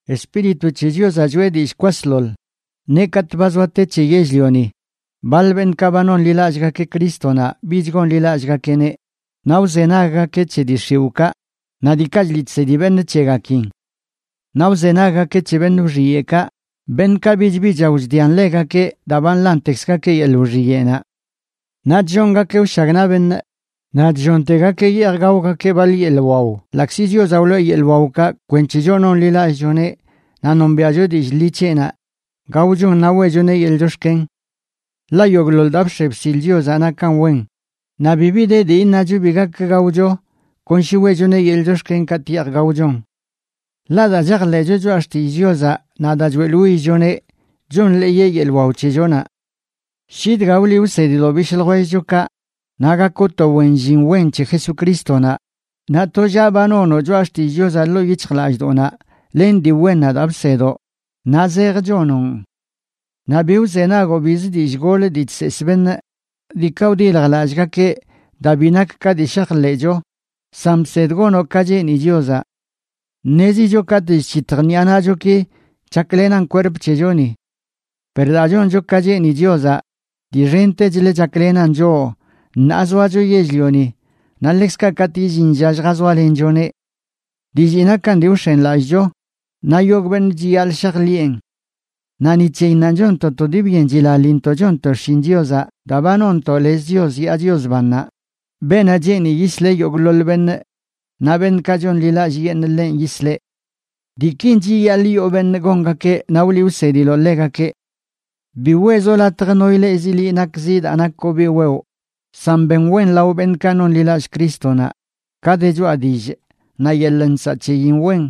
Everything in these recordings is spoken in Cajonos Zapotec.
Espíritu c̱he Chiozaꞌ choꞌe dillꞌ kwasḻoḻ, neꞌ katꞌ ba zoa te c̱he yell-lioni, baḻ beṉꞌkaꞌ ba nonḻilallꞌgakeꞌ Crístonaꞌ bich gonḻilallꞌgakeꞌneꞌ, naꞌ wzenaggakeꞌ c̱he dii x̱iwꞌkaꞌ naꞌ diikaꞌ chliꞌ chsedi beṉꞌ c̱hegakin. Naꞌ wzenaggakeꞌ c̱he beṉꞌ wxiyeꞌkaꞌ, beṉꞌkaꞌ bichbi chao chdian ḻegakeꞌ daa ba nḻantekzgakeꞌ yeḻꞌ wxiyeꞌnaꞌ. Naꞌ chllongakeꞌ wshagnaꞌ beṉꞌ, naꞌ chllontegakeꞌ yeej gaogakeꞌ baḻ yeḻꞌ wao ḻaꞌkzi Chiozaꞌ wloꞌe yeḻꞌ waokaꞌ kwenc̱he choꞌ nonḻiꞌlallꞌchoneꞌ naꞌ nombiaꞌcho dillꞌ ḻi c̱heꞌnaꞌ gaochon naꞌ weꞌchoneꞌ yeḻꞌ chox̱ken. Ḻaꞌ yogꞌḻoḻ daa bx̱e bsil Chiozaꞌ nakan wen, naꞌ bibi de dii iṉacho bi gak gaocho kon shi weꞌchoneꞌ yeḻꞌ chox̱ken katꞌ yeej gaochon. Ḻaꞌ daa chajḻeꞌcho choꞌa xtillꞌ Chiozaꞌ naꞌ daa choeꞌḻwillchoneꞌ, chonḻeeyeꞌ yeḻꞌ wao c̱hechonaꞌ. Shi dga wliꞌ wsediloꞌ bishꞌ ljwellchokaꞌ, naꞌ gakoꞌ to wen llin wen c̱he Jesucrístonaꞌ, naꞌ tollaꞌ ba nonoꞌ choꞌa xtillꞌ Chiozaꞌ ḻoo yic̱hjlallꞌdoꞌnaꞌ len dii wennaꞌ daa bsedoꞌ naꞌ zej chonoꞌn. Naꞌ bi wzenagoꞌ bizə dillꞌ gol dii chseesꞌ beṉꞌ, diikaꞌ wdiljlallꞌgakeꞌ daa bi nak ka dii shajḻeꞌcho, san bsed gonoꞌ ka cheeni Chiozaꞌ. Ṉezicho katꞌ chc̱hitj ṉiꞌa naꞌchoki chaklenan kwerp c̱hechoni. Per daa choncho ka cheeni Chiozaꞌ, dii xentechlə chaklenan choꞌ ṉaa zoacho yell-lioni naꞌ ḻekzkaꞌ katꞌ illin lla lljazoalenchoneꞌ. Dillii nakan dii wx̱enlallꞌcho, naꞌ yogꞌ beṉꞌ chiyaḻꞌ shajḻiꞌen. Naꞌ ni c̱heyinnanꞌ chonntoꞌ to dii byen chilaḻintoꞌ chonntoꞌ xshin Chiozaꞌ daa ba nonntoꞌ lez Chios yaa Chios bannaꞌ, beenaꞌ cheeni yisleꞌ yogꞌḻoḻ beṉꞌ, naꞌ beṉꞌkaꞌ chonḻilallꞌyeṉꞌ ḻenꞌ yisleꞌ. Diikin chiyaḻꞌ yoo beṉꞌ gongakeꞌ naꞌ wliꞌ wsediloꞌ ḻegakeꞌ. Bi weezoꞌ latj no ileꞌzi liꞌ nakzi daa nakoꞌ biꞌ wewꞌ, san ben wen lao beṉꞌkaꞌ nonḻiꞌlallꞌ Crístonaꞌ, ka de choꞌa dillꞌ, naꞌ yeḻꞌ nsaꞌ c̱heyin wen,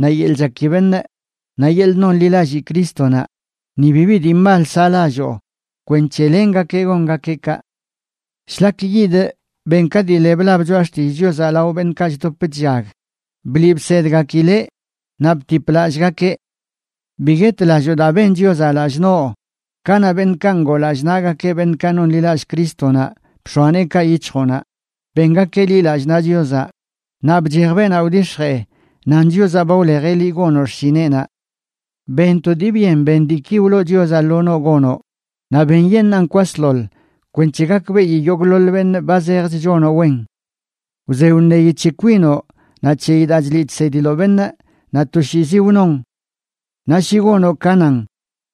naꞌ yeḻꞌ chaki beṉꞌ, naꞌ yeḻꞌ nonḻilallii Crístonaꞌ, ni bibi dii mal saꞌlalloo, kwenc̱he lengakeꞌ gongakeꞌ kaꞌ. Shlak yidꞌ, ben ka dii le blab Choꞌa Xtillꞌ Chiozaꞌ lao beṉꞌkaꞌ chdop chllag, bliꞌ bsedgakileꞌ, naꞌ btip lallꞌgakeꞌ. Bi guetlalloo daa ben Chiozaꞌ lallꞌ noꞌ kanaꞌ beṉꞌkaꞌ ngoo lallꞌ naꞌgakeꞌ beṉꞌkaꞌ nonḻilallꞌ Crístonaꞌ bx̱oa neekaꞌ yic̱hjoꞌnaꞌ bengakeꞌ liꞌ lallꞌ naꞌ Chiozaꞌ, naꞌ bchej beenaꞌ wdix̱jee nan Chiozaꞌ ba wlejeꞌ liꞌ gonoꞌ xshineꞌnaꞌ. Ben to dii byen ben diiki wloo Chiozaꞌ lo noꞌ gonoꞌ, naꞌ benyeṉaan kwasḻoḻ kwenc̱he gakbeꞌi yogꞌḻoḻ beṉꞌ ba zejch chonoꞌ wen. Wze wṉeyi c̱he kwinoꞌ naꞌ c̱heyi daa chliꞌ chsediloꞌ beṉꞌ, naꞌ toshiizi wnoꞌn. Naꞌ shi gonoꞌ ka nan,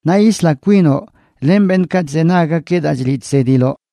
naꞌ yisla kwinoꞌ len beṉꞌkaꞌ chzenaggakeꞌ daa chliꞌ chsediloꞌ.